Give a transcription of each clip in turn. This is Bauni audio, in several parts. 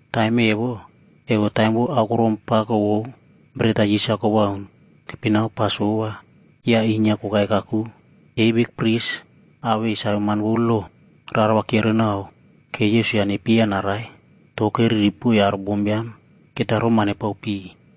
Taim evo, evo taim vou Aokorom Pako vou Beret-a Yis-a Kowauna keipinao Pasova, ya inyia kokai kakuke. Yei bikpris awei saveman vou lo rara va kyiorenao ke Yesus-a nepyeiya narai, to keriri poiy aro bombiam keta roma nepao piy.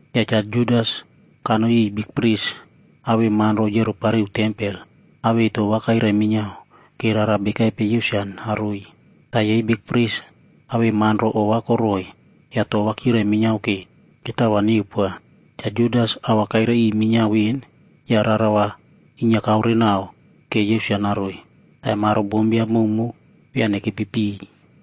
Ya Cha Judas kanoi iꞌiy bikpris awei manro yiorepariu tempel awei to va kairai minyiao ke rara bekaipe Yesus-a naroiy. Ta yei bikpris awei manro ova koroꞌoi ya to va kyirai minyiao ke ketao va neupoa. Cha Judas a va kairai iꞌiy minyiao ven ya rara va inyia kaorenao ke Yesus-a naroiy. Taim aro bombiam mowmow via nekepi piy.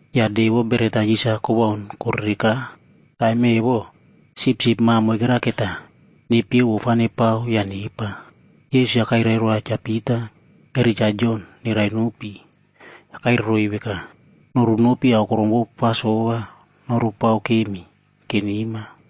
Ya De vou Beret-a Yis-a Kowaun korereka. Taim evo, sipsip ma moikera keta nepyeu ofa nepao ya nepa. Yesus-a kairai roa Cha Pita eri Cha Jon nerai nopi, ya kairai roiy veka, “Norunopi aokorom vou Pasova norupao kemi ke nema.”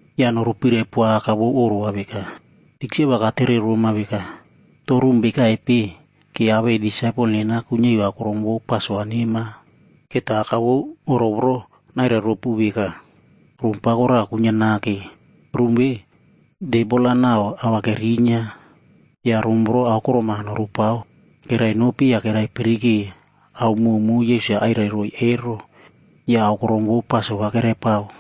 “Ya norupirai poa aka vou oꞌro va veka, ‘Tikse va katere roma veka, “To rum bekaipe ke awei disaipel nena kuinyia iu aokorom vou Pasova nema?” ’ Keta aka vou oꞌro voro nairai ropu veka, ‘Rum pako raꞌa kuinyia nake. Rum ve, tebol-a nau ao va kerinyia. Ya rum voro aokorom-a norupao.’” Kerainopi ya keraipirike ao mowmow Yesus-a airairoiy ero, ya aokorom vou Pasova keraipao.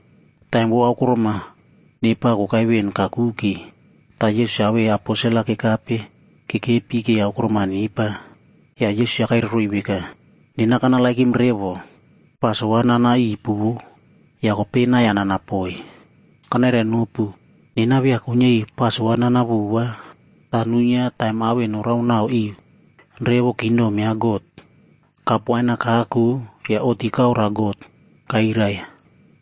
Taim vou aokorom-a nepa kokai ven kakuke, ta Yesus-a awei aposel-a kekape kekepi ke aokorom-a nepa. Ya Yesus-a kairai roiy veka, “Nena kanerenow revo Pasova nananipu vo, ya kopei nai-ya nana poi. Kanairainopu, nena via kuinyia iu Pasova nana vova,b ta nuinyia taim ao en noraonao iu revo kingdom ya God.” Kap wain-a kako ya oꞌti kaoroa God, ya kairai,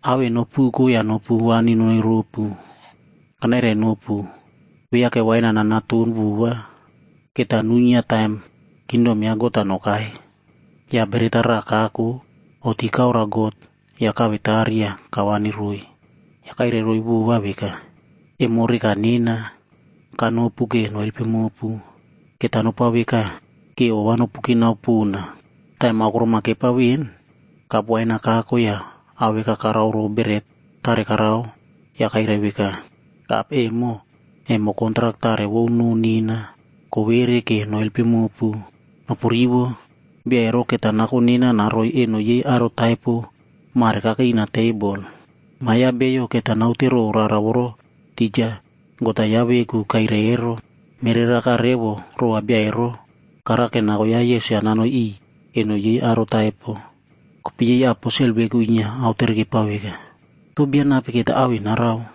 “Ao en nopuko ya nopu wani nonoi ropu. Kanairainopu, viake wain-a nanaton vova, keta nuinyia taim kingdom ya God-a nokai.” Ya beret-a raꞌa kako, oꞌti kaoroa God ya kawetari ya kawani roiy. Ya kairai roiy vova veka, “Emo reka nena, kanopu ke noelpim mopu. Keta nopao veka, ke ova nopu kinao pona.” Taim aokorom-a kepa ven, kap wain-a kako ya ao veka karao row beret tare karao ya kairai veka, “Kap emo, emo kontrak tarec vou noꞌo nena, kowere ke noelpim mopu. Nopurivo! Bia ero keta nako nena naroiy eno yei aro taipo, mare kakei ina tebol. Ma ya Bio keta naute row rara voro tija God-a yaꞌa veku kairai ero. Mereraka revo rova bia ero karake nako ya Yesus-a nanoi iꞌiy eno yei aro taipo.” Kopei yei aposel veku inyia aotere kepao veka, “To bia nape keta ao en narao?”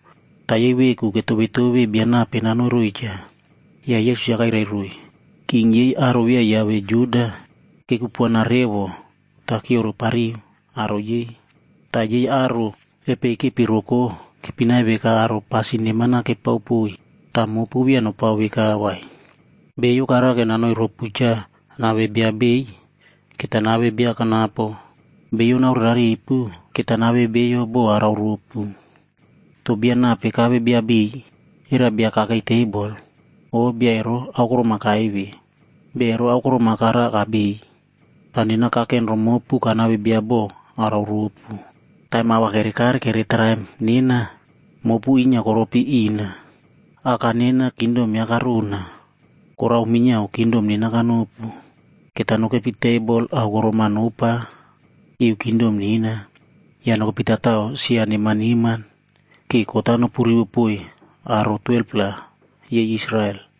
Ta yei veku ketovetove bia nape nanoi roiy cha. Ya Yesus-a kairai roiy, “King yei aro via yiave Juda, kekupuana revo ta kyiorepariy aro yei. Ta yei aro epei kepi roko, keipinai veka aro pasin neman-a kepao poiy. Ta mopu via nopao veka vai. Bio karake nanoi ropu cha nave bia beiy, keta nave bia kanapo. Bio naoreraripu, keta nave bio bo arao ropu. To bia nape kave bia beiy? Era bia kakei tebol, o bia ero aokorom-a kaive?d Bia ero aokorom-a kara kabeiy. Ta nena kaken romopu kanave bia bo arao ropu. Taim ao va kerekare kere traim nena, mopu inyia koropi ina. Aka nena kingdom yaꞌa karona, ta nena minyiao kingdom ve kanopu. Keta nokepi tebol aokorom-a nopa iu kingdom nena. Ya nokepi tatao sia neman neman, ke kot-a nopurivo poiy aro 12-pla yei Israel.”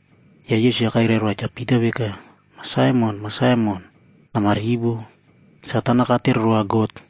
Ya Yesus-a kairai roa Cha Pita veka, “Ma Saimon, Ma Saimon, namarivo! Satan-a katere roa God,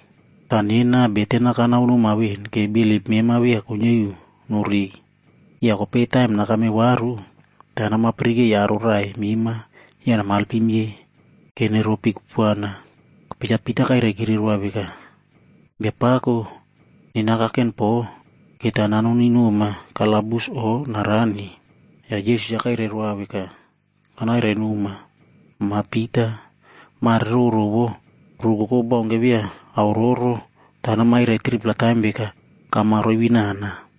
Ta nena beten-a kanaonoma ven ke bilip mema via kuinyia iu norei. Ya kopei taim nakame varu, nama pirikei aro raꞌai mema ya namalpim yei ke neropi kupuana.” Kopei Cha Pita kairaikire roa veka, “Biapako, nena kaken po, keta nanoni noma kalabus o narani.” Ya Yesus-a kairai roa veka, “Kanairai noma, Ma Pita, mare roro vo, rukoko baunke via aororo, ta namairai 3-pla taim veka kama roivinana.”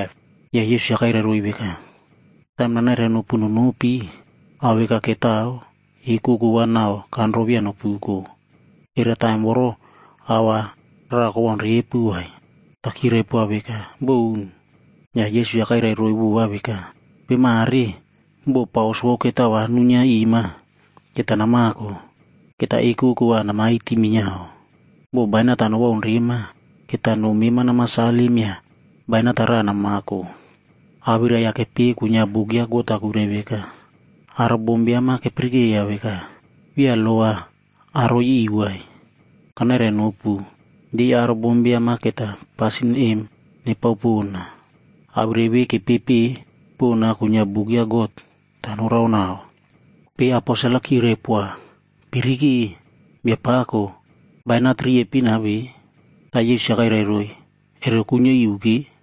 Ya Yesus-a kairai roiy veka, “Taim nanairai nopu nonopi, ao veka ketao, ekoko va nau kanro via nopuko. Era taim voro ao raꞌa kowaun repu vai?” Ta kyirai poa veka, “Boun!” Ya Yesus-a kairai roiy vova veka, “Kopei mare, bo paus vou ketao va nuinyia ima, keta namako. Keta ekoko va namaiti minyiao. Bo bainat-a nowaun rema, keta no mema nama salim ya bainat-a raꞌa namako. Awirai-ya kepeꞌe kuinyia buk ya God-a kuirai veka, ‘Aro bombiam-a kepirikeiya veka, via lo va aroi iu vai.’ Kanairainopu, yei aro bombiam-a keta pasin em nepao pona. Awirai ve kepepeꞌe pona kuinyia buk ya God, Kopei aposel-a kyirai poa, “Pirike, Biapako, bainat riepin-a ve.” Ta Yesus-a kairai roiy, “Ero kuinyia iu ke.”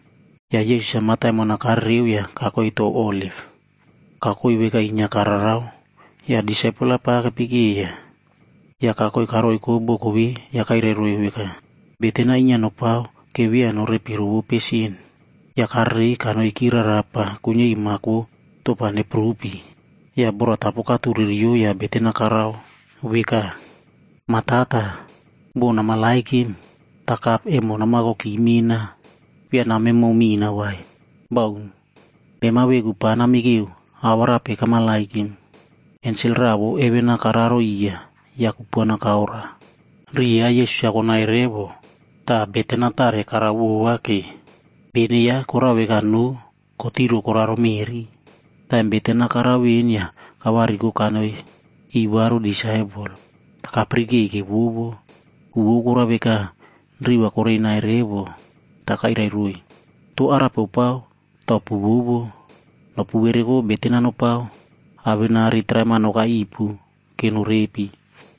Ya Yesus-a mataimon-a karereo ya kakoi tou Oliv. Kakoi veka inyia kararao, ya disaipel-a pa kepekeiya. Ya kakoi karoiko boko ve, ya kairai roiy veka, “Beten-a inyia nopao ke via norepi rovope sin” Ya karerei kanoiki rarapa kuinyia iu mak vou topa nepurupi. Ya boratapo katureriyo ya beten-a karao veka, “Ma Tata, bo nameremow, ta kapg emo namakoki mena. Via nameremow mina vai, baun. Mema veku pa namikeo awarape kameremow.” Ensel raꞌa vou heven-a kararo iya, ya kupuana kaoroa. Riꞌi ya Yesus-a konai revo, ta beten-a tare karao vova ke. Bene yaꞌa korao veka noꞌo kotiro koraro meꞌri. Taim beten-a karao ven ya kavariko kanoi iꞌiy varu disaipel, ta kapirikei kevovo. Ku vou korao veka, riꞌi va korei nai revo. Ta kairai roiy, “To korao vekaipe ta kopuvovopu? Nopu vereko beten-a nopao awenari traim-a nokai ipu ke norepi.”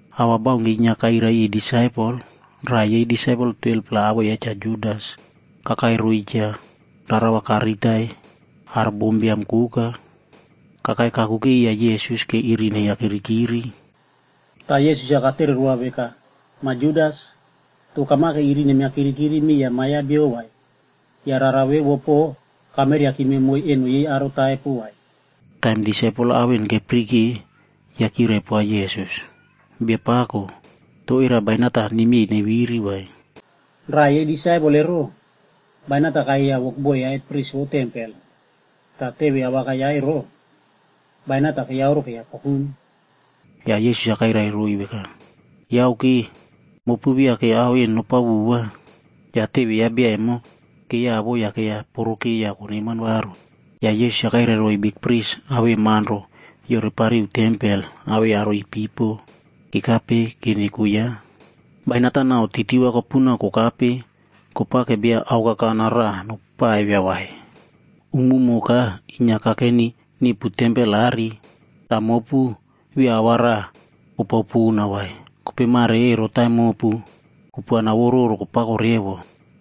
A va baunke inyia kairai iꞌiy disaipel, raꞌa yei disaipel 12-pla awoꞌo ya Cha Judas kakai roiy cha, rara va kariritai aro bombiam koka. Kakai kakuke iya Yesus ke iri neiya kirikiri. Ta Yesus-a katere roa veka, “Ma Judas, to kamake iri nemia kirikiri miya Ma ya Bio vai, ya rara vevo po, kameriakime moiy eno yei aro taipo vai?” Taim disaipel-a ao en kepirike ya kyirai poa Yesus, “Biapako, to era bainat-a nemyei neviri vai?” Raꞌa yei disaipel ero, bainat-a kayeiya wokboi ya hetpris vou tempel. Ta teve awakai yaꞌa ero, bainat-a keiyauro keiya pokum. Ya Yesus-a kairai roiy veka, “Yauke! Mopu via ke ao en nopao vova.” Ya teve ya bia emo keiyavo ya keiya poroke ya koneman varu. Ya Yesus-a kairai roiy bikpris awei manro yiorepariu tempel awei aro ipipo kekape ke neko yaꞌa, “Bainat-a nau titi va kopuna kokape kopake bia aokakana raꞌa nopaivia vai? Umumoka inyia kakeni nipu tempel aꞌari, ta mopu via ao va raꞌa opao pona vai. Kopei mare ero taim mopu, kupuana vou roro kopako revo.”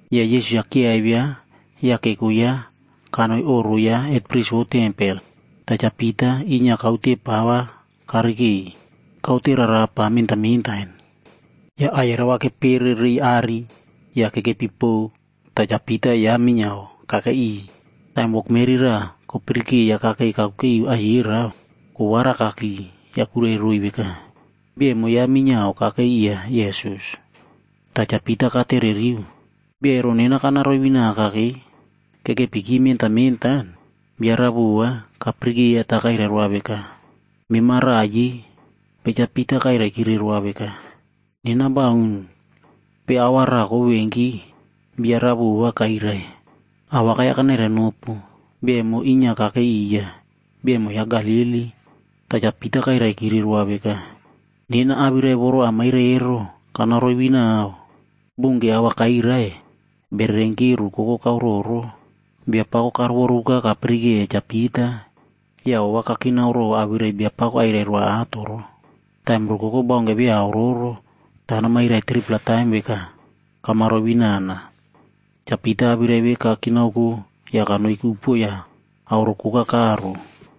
Ya Yesus-a kyiaivia ya keko yaꞌa kanoi oꞌro ya hetpris vou tempel. Ta Cha Pita inyia kaute pa va karikei. Kaute rarapa mentan mentan. Ya aiyerao va kepere reiy aꞌari ya kekepi pow ta Cha Pita yaꞌa minyiao kakei iꞌiy. Taim wokmeri raꞌa kopirikeiya kakei kakuke iu aiyerao, kowarakaki, ya kuirai roiy veka, “Bia emo yaꞌa minyiao kakei iya Yesus.” Ta Cha Pita katereriu, “Bia ero nena kana roivinaka ke.” Kekepiki mentan mentan, bia raꞌa vova kapirikeiya ta kairai roa veka, “Mema raꞌa yei.” Kopei Cha Pita kairaikire roa veka, “Nena baun.” Kopei aua raꞌa kovevenki, bia raꞌa vova kairai, “Awakai-ya kanairai nopu, bia emo inyia kakei iya. Bia emo yaꞌa Galili.” Ta Cha Pita kairaikire roa veka, “Nena awirai voro amairai ero, kana roivinao.” Bounke a va kairai, bererenki rukoko kauroro. Biapako karovoruka kapirikeiya Cha Pita, ya ova kakinaoko row awirai Biapako airai roa ato ro. “Taim rukoko baunke via aororo, ta namairai 3-pla taim veka kama roivinana.” Cha Pita awirai ve kakinaoko ya kanoiki upuo ya aoro koka karo.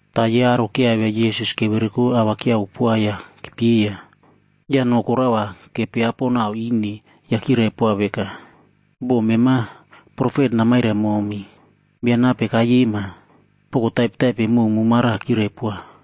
Ta yei aro kyiaivia Yesus kevereko a va kyiavo poa ya kepyeiya. Ya no koraꞌa va kepiapo nau ine ya kyirai poa veka, “Bo mema profet namairai momi, bia nape kaiyema?” Poko taipetaipe mowmow mara kyirai poa.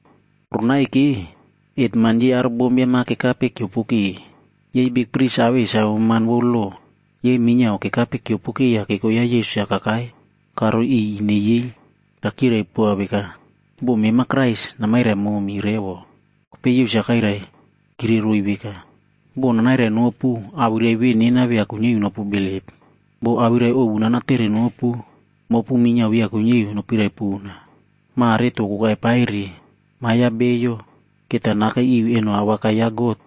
Roronai ke, hetman yei aro bombiam-a kekape kyiopoke. Yei bikpris awei saveman vou lo, yei minyiao kekape kyiopoke ya keko ya Yesus-a kakai karoi iꞌiy ine yei. Ta kyirai poa veka, “Bo mema Krais, namairai momi revo.” Kopei Yesus-a kairaikireroiy veka, “Bo nanairai nopu, awirai ve nena via kuinyia iu nopubilip. Bo awirai ovu nanatere nopu, mopu minyiao via kuinyia iu nopiraipona. Mare to kokai paire, Ma ya Bio keta nakei iu eno awakai ya God,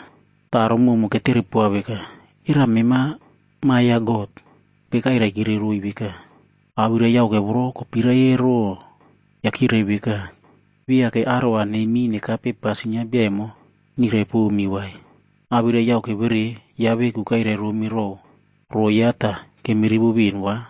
Ta aro mowmow ketere poa veka, “Era mema veku Ma Biam ya God?” Kopei kairaikireroiy veka, “Awirai yauke voro mopu veku kopirai ero.” Ya kyirai veka, “Viake aro va neimiy nekape pasin ya bia emo nyirai pomi vai? Awirai yauke vere yaꞌa veku kairai romi row roꞌo yaꞌa ta kemi rivo ven va.”